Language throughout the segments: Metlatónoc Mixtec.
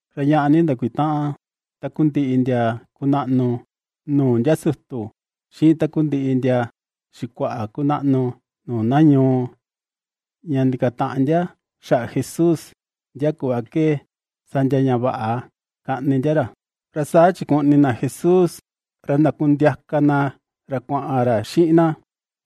Ra ñaꞌa ni ndakutaꞌan takundiꞌi ndia kunaꞌnu nuu ndia sutu, xiꞌin takundiꞌi ndia xikuaꞌa kunaꞌnu nuu na ñuu, ña ndikataꞌan ndia xaꞌa Jesús, ndia kuꞌva ke sa ndia ña vaꞌa kaꞌni ndia ra. Ra saa chikuꞌni na Jesús, ra ndakundiaka na ra kuaꞌan ra xiꞌin na,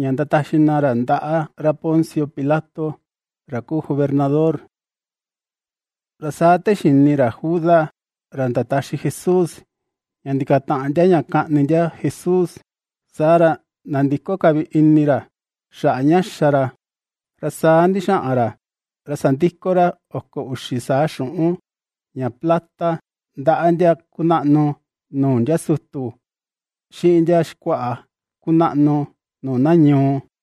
ña ndataxi na ra ndaꞌa ra Poncio Pilato ra kuu gobernador. Ra saa te xini ra Judas ra ndataxi Jesús, ña ndikataꞌan ndia ña kaꞌni ndia Jesús, saa ra nandiko ka vi ini ra xaꞌa ña xa ra, ra saa ndixaꞌan ra sandiko ra oko uxi saa xuꞌun ña plata ndaꞌa ndia kunaꞌnu nuu ndia sutu, xiꞌin ndia xikuaꞌa kunaꞌnu nuu na ñuu,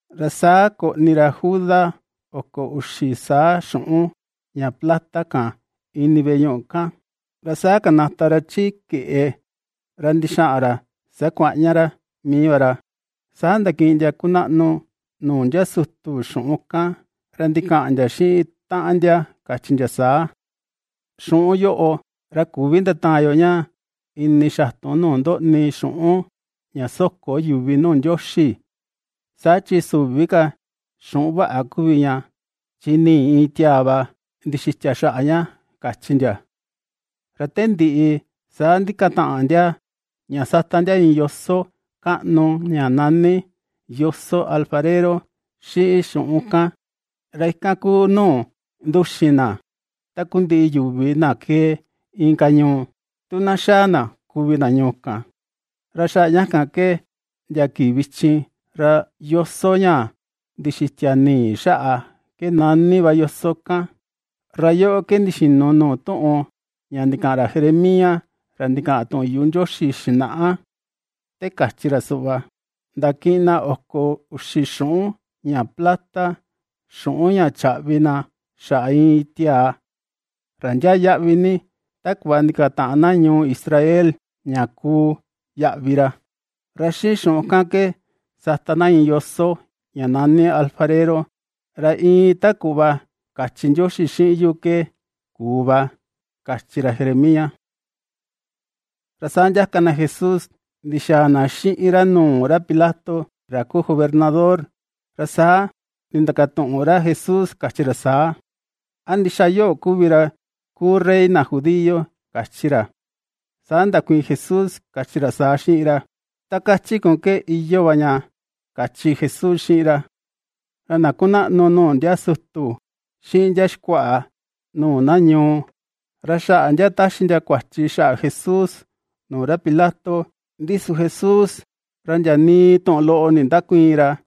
Ra saa koꞌni ra Judas oko uxi saa xuꞌun ña plata kan, ini veꞌe ñuꞌu kan, ra saa kanata ra chi keꞌe ra ndixaꞌan ra sakuaꞌña ra mii va ra. Saa ndakiꞌin ndia kunaꞌnu nuu ndia sutu xuꞌun kan, ra ndikaꞌan ndia xiꞌin taꞌan ndia kachi ndia saa: ―Xuꞌun yoꞌo ra küvi ndataan yo ña ini xatun nuu ndoꞌni xuꞌun ña soko yuvi nuu Ndioxi, saa chi süvi ka xuꞌun vaꞌa kuvi ña, chi nii iin tiaa va ndixitia xaꞌa ña ―kachi ndia. Ra te ndiꞌi saa ndikataꞌan ndia ña sata ndia iin yoso kaꞌnu ña nani “Yoso Alfarero” xiꞌin xuꞌun kan, ra ikan ku nuu nduxin na takundiꞌi yuvi na kee inka ñuu, tu na xaa na kuvi na ñuu kan. Ra xaꞌa ña kan ke, ndia kii vichin ra “Yoso ña ndixitia nii xaꞌa” ke nani va yoso kan. Ra yoꞌo ke ndixinu nuu tuꞌun ña ndikaꞌan ra Jeremías ra ndikaꞌan tuꞌun yuꞌu Ndioxi xinaꞌa, te kachi ra suꞌva: “Ndakiꞌin na oko uxi xuꞌun ña plata, xuꞌun ña chaꞌvi na xaꞌa iin tiaa ra ndiaa yaꞌvi ni, ta kuꞌva ndikataꞌan na ñuu Israel ña kuu yaꞌvi ra, ra xiꞌin xuꞌun kan ke sata na iin yoso, ña nani alfarero, ra iin ta kuꞌva kachi Ndioxi xiꞌin yu ke kuu va”, kachi ra Jeremías. Ra saa ndiaka na Jesús ndixaa na xiꞌin ra nuu ra Pilato ra kuu gobernador, ra saa nindakatuꞌun ra Jesús kachi ra saa: ―¿A ndixa yoꞌo kuvi ra kuu rey na Judío? ―kachi ra. Saa ndakuiin Jesús kachi ra saa xiꞌin ra: ―Ta kachi kun ke iyoo va ña ―kachi Jesús xiꞌin ra. Ra na kunaꞌnu nuu ndia sutu, xiꞌin ndia xikuaꞌa nuu na ñuu, ra xaꞌa ndia taxi ndia kuachi xaꞌa Jesús nuu ra Pilato, ndi su Jesús ra ndia nii tuꞌun loꞌo nindäkuiin ra.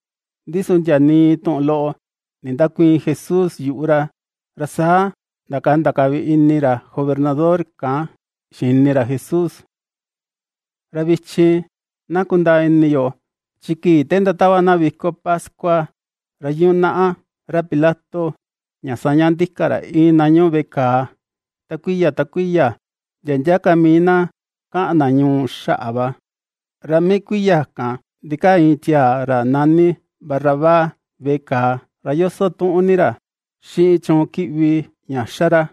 Ndi su ndia nii tuꞌun loꞌo nindäkuiin Jesús yuꞌu ra, ra saa ndakanda ka vi ini ra gobernador kan xini ra Jesús. Ra vichin na kundaa ini yo, chi kii te ndatava na viko pascua, ra yunaꞌa ra Pilato ña saña ndika ra iin na ñuꞌu veꞌe kàà, ta kuiya ta kuiya, ndia ndia ka mii na kaꞌan na ñuu xaꞌa va. Ra mii kuiya kan ndikaa iin tiaa, ra nani Barrabás veꞌe kàà, ra yoso tuꞌun ni ra xiꞌin chuun kiꞌvi ña ^xa ra.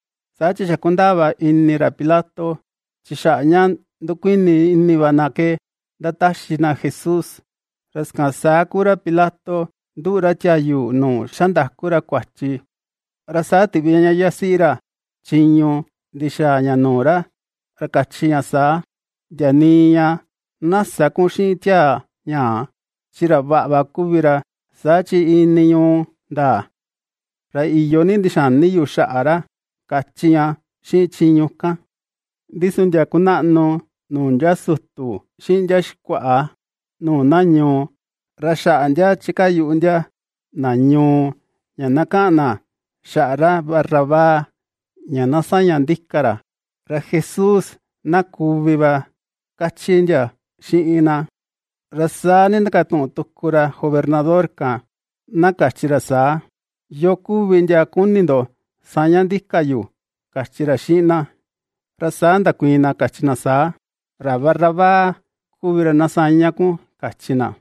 Saa chi xa kundaa va ini ra Pilato, chi xaꞌa ña ndukuini ini va na ke ndataxi na Jesús. Ra sakan saa kuu ra Pilato nduꞌu ra tiayu nuu xandaku ra kuachi, ra saa tiꞌvi ña yasiꞌi ra chiñu ndixaa ña nuu ra, ra kachi ña saa: ―Ndia nii ña na sä kun xiꞌin tiaa ñaa, chi ra vaꞌa va kuvi ra, saa chi iin ni ñuu ndaa, ra iyo ni ndixani yu xaꞌa ra ―kachi ña xiꞌin chuun kan. Ndi su ndia kunaꞌnu nuu ndia sutu xiꞌin ndia xikuaꞌa nuu na ñuu, ra xaꞌa ndia chikaa yuꞌu ndia na ñuu ña na kaꞌan na xaꞌa ra Barrabás ña na saña ndika ra, ra Jesús, na kuvi va kachi ndia xiꞌin na. Ra saa nindakatuꞌun tuku ra gobernador kan na kachi ra saa: ―¿Yoo kuvi ndia kuni ndo saña ndika yu?, ―kachi ra xiꞌin na. Ra saa ndakuiin na kachi na saa: ―Ra Barrabás kuvi ra na saña kun ―kachi na.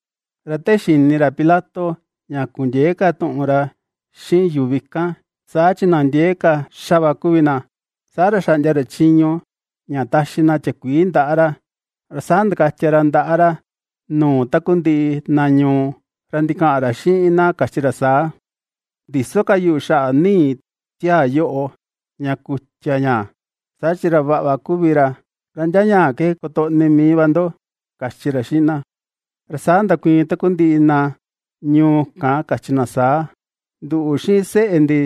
Ra te xini ra Pilato ña kundiëe ka tuꞌun ra xiꞌin yuvi kan, saa chi na ndiee ka xaꞌa xa va kuvi na, saa ra xaꞌndia ra chiñu ña taxi na tiakuii ndaꞌa ra, ra saa ndakatia ra ndaꞌa ra nuu takundiꞌi na ñuu, ra ndikaꞌan ra xiꞌin na kachi ra saa: ―Ndïso ka yu xaꞌa nii tiaa yoꞌo, ña kutia ña, saa chi ra vaꞌa va kuvi ra, ra ndia ñaa ke kotoꞌni mii ka va ndo ―kachi ra xiꞌin na. Ra saa ndakuiin takundiꞌi na ñuu kan kachi na saa: ―Nduꞌu, xiꞌin seꞌe ndi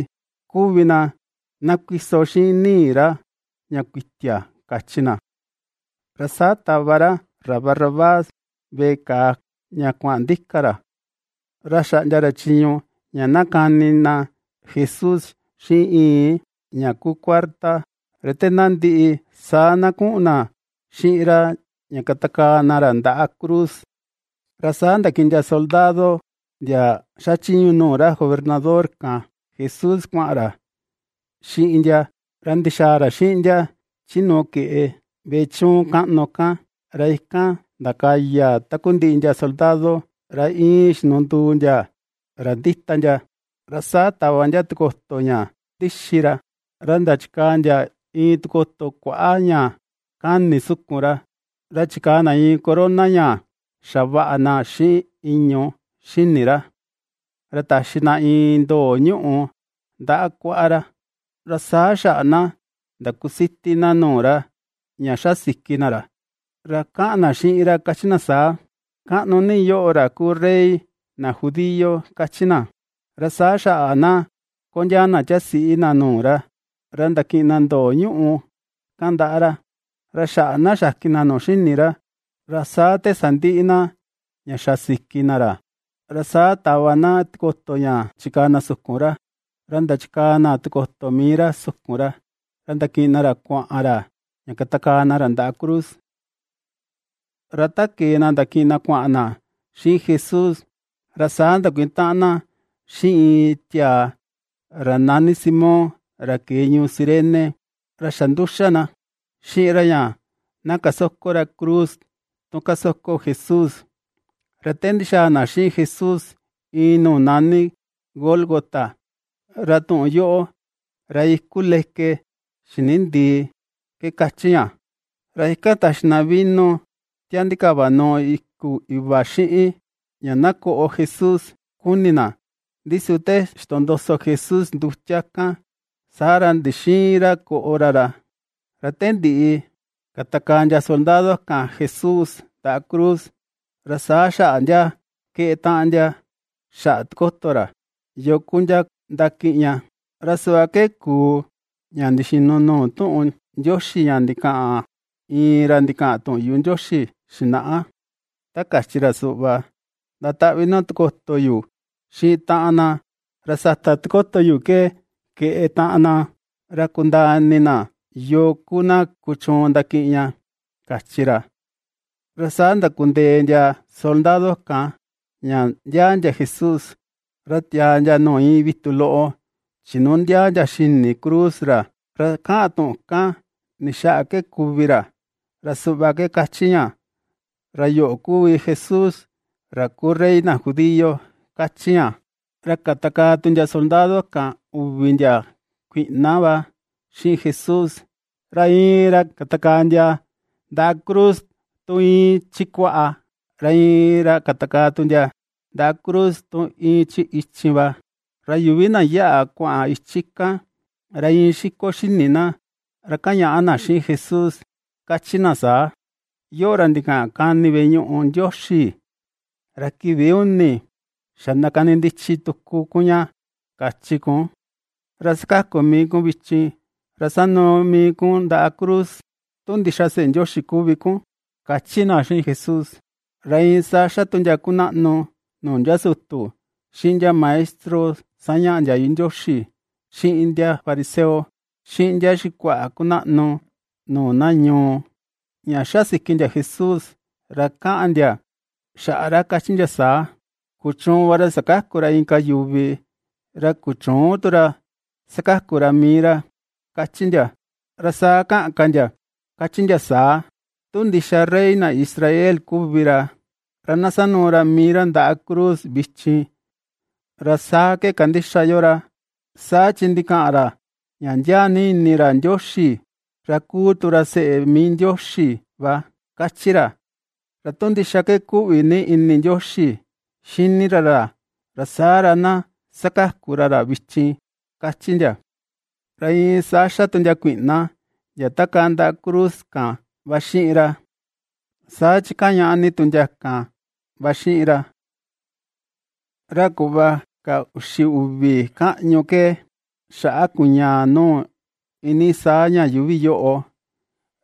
kuvi na, na kuiso xiꞌin nii ra ña kutia ―kachi na. Ra saa tava ra ra Barrabás veꞌe kàà ña kuaꞌan ndika ra, ra xaꞌndia ra chiñu ña na kani na Jesús xiꞌin ñii ña kuu kuarta, ra te na ndiꞌi, saa na kuꞌun na xiꞌin ra ña katakaa na ra ndaꞌa cruz. Ra saa ndakiꞌin ndia soldado ndia xachiñu nuu ra gobernador kan Jesús, kuaꞌan ra xiꞌin ndia, ra ndixaa ra xiꞌin ndia chi nuu keꞌe veꞌe chiñu kaꞌnu kan, ra ikan ndakaya takundiꞌi ndia soldado ra iin xinunduu ndia ra ndita ndia. Ra saa tava ndia tikoto ña ndixi ra, ra ndachikaa ndia iin tikoto kuaꞌa ña kani sukun ra, ra chikaa na iin corona ña xavaꞌa na xiꞌin ìñu̱ xini ra, ra taxi na iin ndoo ñuꞌù ndaꞌa kuaꞌa ra, ra saa xaꞌa na ndakusiti na nuu ra, ña xa siki na ra, ra kaꞌan na xiꞌin ra kachi na saa: ―Kaꞌnu ni yoꞌo ra kuu rey na judío ―kachi na. Ra saa xaꞌa na kondiaa na tiasiꞌi na nuu ra, ra ndakiꞌin na ndoo ñuꞌù kan ndaꞌa ra, ra xaꞌa na xakin na nuu xini ra. Ra saa te sandiꞌi na, ña xa siki na ra, ra saa tava na tikoto ña chikaa na sukun ra, ra ndachikaa na tikoto mii ra sukun ra, ra ndakiꞌin na ra kuaꞌan ra xiꞌin na, ña katakaa na ra ndaꞌa cruz. Ra ta kee na ndakiꞌin na kuaꞌan na xiꞌin Jesús, ra saa ndakutaꞌan na xiꞌin iin tiaa ra nani Simón ra kee ñuu Cirene, ra xa nduxa na xiꞌin ra ña na kasoko ra cruz tun kasoko Jesús. Ra te ndixaa na xiꞌin Jesús iin nuu nani Gólgota, ra tuꞌun yoꞌo: “Ra iku leke xini ndii” ke kachi ña, ra ikan taxi na vino tia ndikava nuu iku iva xiꞌin, ña na koꞌo Jesús kuni na, ndi su te ixtondoso Jesús ndutia kan, saa ra ndixïin ra koꞌo ra rá. Ra te ndiꞌi katakaa ndia soldado kan Jesús ndaꞌa cruz; ra saa xaꞌa ndia keꞌe taꞌan ndia xaꞌa tikoto ra, yoo ku ndia ndakiꞌin ña. Ra suꞌva ke kuu ña ndixinu nuu tuꞌun Ndioxi ña ndikaꞌan iin ra ndikaꞌan tuꞌun yuꞌu Ndioxi xinaꞌa, ta kachi ra suꞌva: “Ndataꞌvi na tikoto yu xiꞌin taꞌan na, ra sata tikoto yu ke, keꞌe taꞌan na, ra kundaa ini na yoo ku na kuchuun ndakiꞌin ña”, kachi ra. Ra saa ndakundee ndia soldado kan ña ndiaa ndia Jesús. Ra tia̱à ndia nuu iin vitu loꞌo chinundiaa ndia xini cruz ra, ra kaꞌan tuꞌun kan ni xaꞌa ke kuvi ra, ra suꞌva ke kachi ña: “Ra yoꞌo ku Jesús ra kuu Rey na Judío”, kachi ña. Ra katakaa tu ndia soldado kan uvi ndia kuiꞌna va xiꞌin Jesús, ra iin ra katakaa ndia ndaꞌa cruz tu iin chi kuaꞌa, ra iin ra katakaa tu ndia ndaꞌa cruz tu iin chi ichin va. Ra yuvi na yaꞌa kuaꞌan ichi kan, ra iin xiko xini na, ra kañaꞌa na xiꞌin Jesús, kachi na saa: ―¡Yoꞌo, ra ndikaꞌan kani veꞌe ñuꞌu Ndioxi, ra kii uni xa ndakanindichi tuku kun ña, kachi kun, ra sakaku mii kun vichin, ra sanuu mii kun ndaꞌa cruz, tu ndixa seꞌe Ndioxi kuvi kun! ―kachi na xiꞌin Jesús. Ra iin saa xa tu ndia kunaꞌnu nuu ndia sutu, xiꞌin ndia maestro sañaꞌa ndiayu Ndioxi, xiꞌin ndia fariseo, xiꞌin ndia xikuaꞌa kunaꞌnu nuu na ñuu, ña xasiki ndia Jesús, ra kaꞌan ndia xaꞌa ra kachi ndia saa: ―Kuchuun va ra sakaku ra inka yuvi, ra kuchüun tu ra sakaku ra mii ra ―kachi ndia. Ra saa kaꞌan ka ndia kachi ndia saa: ―Tu ndixa Rey na Israel kuvi ra, ra na sanuu ra mii ra ndaꞌa cruz vichin, ra saa ke kandixa yo ra. Saa chi ndikaꞌan ra ña ndiaa ni ini ra Ndioxi, ra kuu tu ra seꞌe mii Ndioxi va kachi ra. Ra tu ndixa ke kuꞌvi ni ini Ndioxi xini ra ra, saa ra na sakaku ra ra vichin ―kachi ndia. Ra iin saa xa tu ndia kuiꞌna, ndia takaa ndaꞌa cruz kan va xiꞌin ra, saa chi kañaꞌa ni tu ndia kan va xiꞌin ra. Ra kuꞌva ka uxi uvi kaꞌñu ke, xaꞌa kuñaa nuu iinii saa ña yuuvi yoꞌo,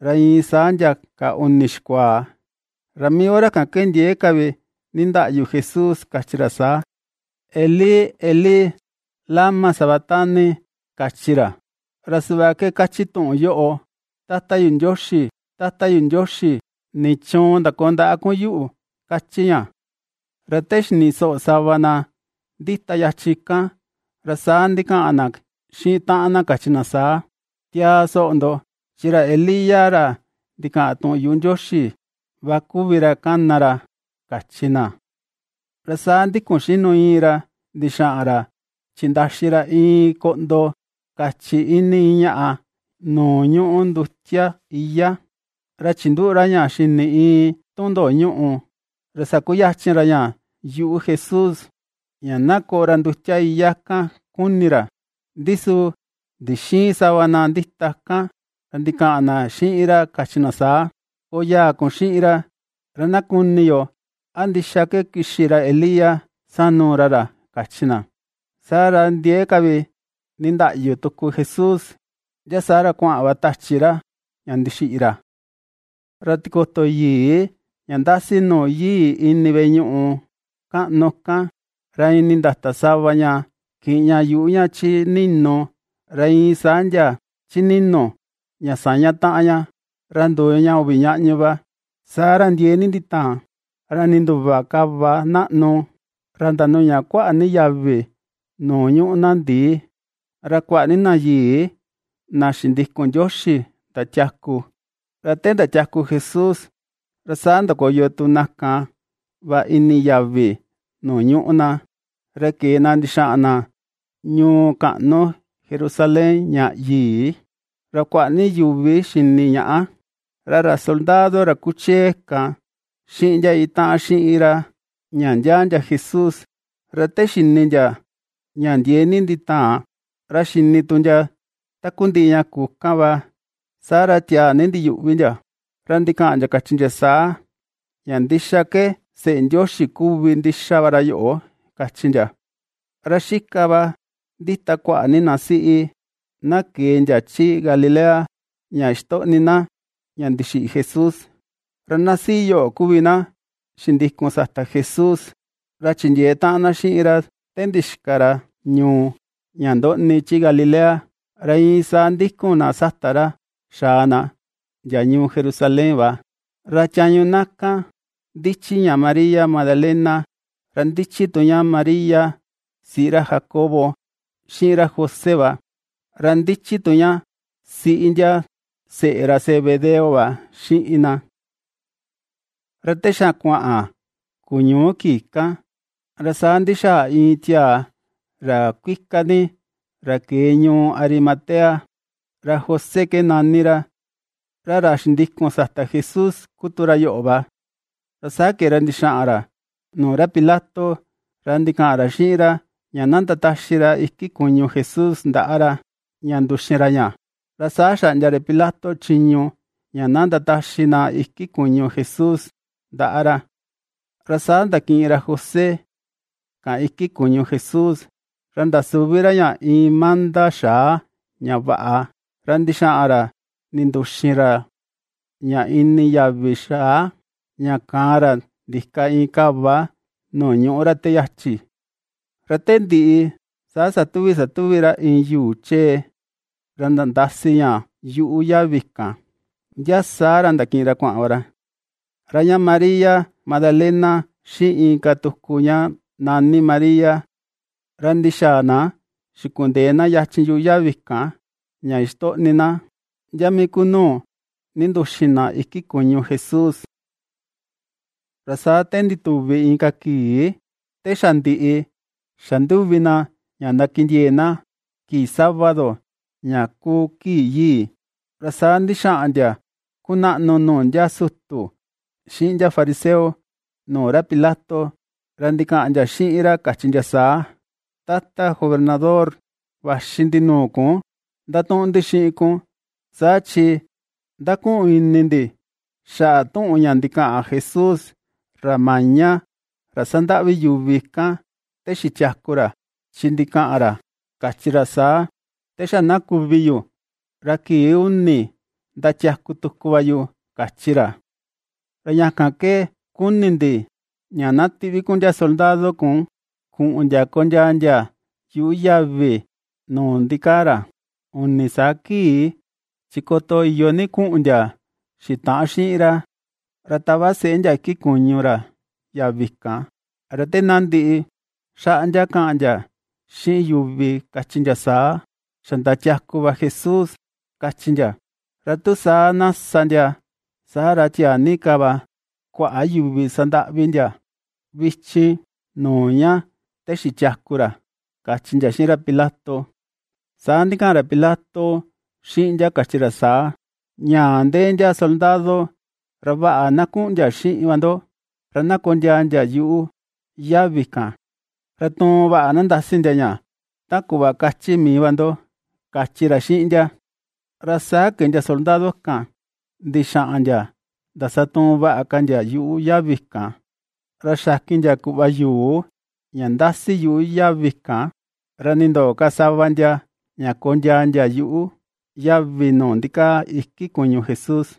ra iin saa ndia ka uni xikuaa. Ra mii hora kan ndiee ka vi nindaꞌyu Jesús kachi ra saa: ―Elí, Elí, ¿lama sabactani? ―kachi ra. Ra suꞌva ke kachi tuꞌun yoꞌo: “Tata yu Ndioxi, Tata yu Ndioxi, ¿nichuun ndakoo ndaꞌa kun yuꞌu?”, ^kachi ña. Ra te xini soꞌo sava na ndita yachi kan, ra saa ndikaꞌan na xiꞌin taꞌan na kachi na saa: ―Tiaa soꞌo ndo, chi ra Elías ra ndikaꞌan tuꞌun yuꞌu Ndioxi va kuvi ra kana ra ―kachi na. Ra saa ndikun xinu iin ra ndixaꞌan ra chindaxi ra iin koꞌndo kachi ini iin ñaꞌa nuu ñuꞌu ndutia iyá, ra chinduꞌu ra ña xini iin itun ndoo ñuꞌu, ra sakuyachin ra ña yuꞌu Jesús ña na koꞌo ra ndutia iyá kan kuni ra. Ndi su ndixïin sava na ndita kan, ra ndikaꞌan na xiꞌin ra kachi na saa: ―Koyaa kun xiꞌin ra, ra na kuni yo a ndixa ke kixi ra Elías sanuu ra ra ―kachi na. Saa ra ndiee ka vi nindaꞌyu tuku Jesús, ndia saa ra kuaꞌan va tachi ra ña ndixiꞌi ra. Ra tikoto yii ña ndasi nuu yii ini veꞌe ñuꞌu kaꞌnu kan, ra iin nindata sava ña, kiꞌin ña yuꞌu ña chi ni̱nù ra iin saa ndia chi ni̱nu̱, ña saña taꞌan ña, ra nduu ña uvi ñaꞌñu va. Saa ra ndiee ni nditaan, ra ninduva kava naꞌnu; ra ndanuña kuaꞌa ni yavi nuu ñuꞌu na ndii, ra kuaꞌa ni na yii, na xindikun Ndioxi, ndatiaku. Ra te ndiatiaku Jesús, ra saa ndakoyo tu na kan va ini yavi nuu ñuꞌu na, ra kee na ndixaꞌan na ñuu kaꞌnu Jerusalén ña yii, ra kuaꞌa ni yuvi xini ñaꞌa. Ra ra soldado ra kuchee kan xiꞌin ndia itaꞌan xiꞌin ra, ña ndiaa ndia Jesús, ra te xini ndia ña ndiee ni nditaan, ra xini tu ndia takundiꞌi ña kuu kan va, saa ra tiaa ni ndiyuꞌvi ndia, ra ndikaꞌan ndia kachi ndia saa: ―Ña ndixa ke seꞌe Ndioxi kuvi ndixa va ra yoꞌo ―kachi ndia. Ra xika va ndita kuaꞌa ni na siꞌi, na kee ndia chi Galilea, ña ixtoꞌni na, ña ndixiꞌi Jesús. Ra na siꞌi yoꞌo kuvi na xindikun sata Jesús, ra chindiee taꞌan na xiꞌin ra te ndixika ra ñuu ña ndoꞌni chi Galilea, ra iin saa ndikun na sata ra xaa na, ndia Jerusalén va. Ra tiañu na kan ndichi ña María Magdalena, ra ndichi tu ña María siꞌi ra Jacobo xiꞌin ra José va, ra ndichi tu ña siꞌi ndia seꞌe ra Zebedeo va xiꞌin na. Ra te xa kuaꞌan kuñuu kii kan, ra saa ndixaa iin tiaa ra kuika ni, ra kee ñuu Arimatea, ra José ke nani ra, ra ra xindikun sata Jesús ku tu ra yoꞌo va. Ra saa kee ra ndixaꞌan ra nuu ra Pilato, ra ndikaꞌan ra xiꞌin ra, ña na ndataxi ra iki kuñu Jesús ndaꞌa ra, ña nduxin ra ña. Ra saa xaꞌndia ra Pilato chiñu ña na ndataxi na iki kuñu Jesús ndaꞌa ra. Ra saa ndakiꞌin ra José kan iki kuñu Jesús, ra ndasuvi ra ña iin manda xaa ña vaꞌa, Ra ndixaꞌan ra ninduxin ra ña ini yavi xaa, ña kaan ra ndika iin kava nuu ñuꞌú ra te yachi. Ra te ndiꞌi saa satuvi satuvi ra iin yuu chee ra nandasi ña yuꞌu yavi kan, ndia saa ra ndakiꞌin ra kuaꞌan va ra. Ra ña María Magdalena, xiꞌin inka tuku ña nani María, ra ndixaa na xikundee na yachin yuꞌu yavi kan, ña ixtoꞌni na ndia mii ku nuu ninduxin na iki kuñu Jesús. Ra saa te ndituvi inka kii, te xa ndiꞌi xa nduvi na ña ndakindiee na kii sábado, ña kuu kii yii, ra saa ndixaꞌan ndia kunaꞌnu nuu ndia sutu, xiꞌin ndia fariseo nuu ra Pilato, ra ndikaꞌan ndia xiꞌin ra kachi ndia saa: ―Tata gobernador, vaxi ndi nuu kun ndatuꞌun ndi xiꞌin kun, saa chi ndakuꞌun ini ndi xaꞌa tuꞌun ña ndikaꞌan Jesús, ra maña, ra sandaꞌvi yuvi kan, te xitiaku ra, chi ndikaꞌan ra kachi ra saa: “Te xa na kuvi yu ra kii uni ndatiaku tuku va yu”, kachi ra. Ra ña kan ke kuni ndi, ña na tiꞌvi kun ndia soldado kun kuꞌun ndia kondiaa ndia yuꞌu yavi nuu ndikaa ra uni saa kii. Chi koto iyo ni kuꞌun ndia xitaꞌan xiꞌin ra, ra tava seꞌe ndia iki kuñu ra yavi kan, ra te na ndiꞌi, xaꞌa ndia kaꞌan ndia xiꞌin yuvi, kachi ndia saa: “Xa ndatiaku va Jesús”, kachi ndia. Ra tu saa na sa ndia, saa ra tiaa ni ka va kuaꞌa yuvi sandaꞌvi ndia vichin nuu ña te xitiaku ra ―kachi ndia xiꞌin ra Pilato. Saa ndikaꞌan ra Pilato xiꞌin ndia kachi ra saa: ―Ñaa ndee ndia soldado, ra vaꞌa na kuꞌun ndia xiꞌin va ndo, ra na kondiaa ndia yuꞌu yavi kan, ra tuun vaꞌa na nandasi ndia ña, ta kuꞌva kachi mii va ndo ―kachi ra xiꞌin ndia. Ra saa kee ndia soldado kan ndixaꞌan ndia ndasatuun vaꞌa ka ndia yuꞌu yavi kan, ra xakin ndia kuꞌva yuu ña ndasi yuꞌu yavi kan, ra nindoo ka sava ndia ña kondiaa ndia yuꞌu yavi nuu ndikaa iki kuñu Jesús.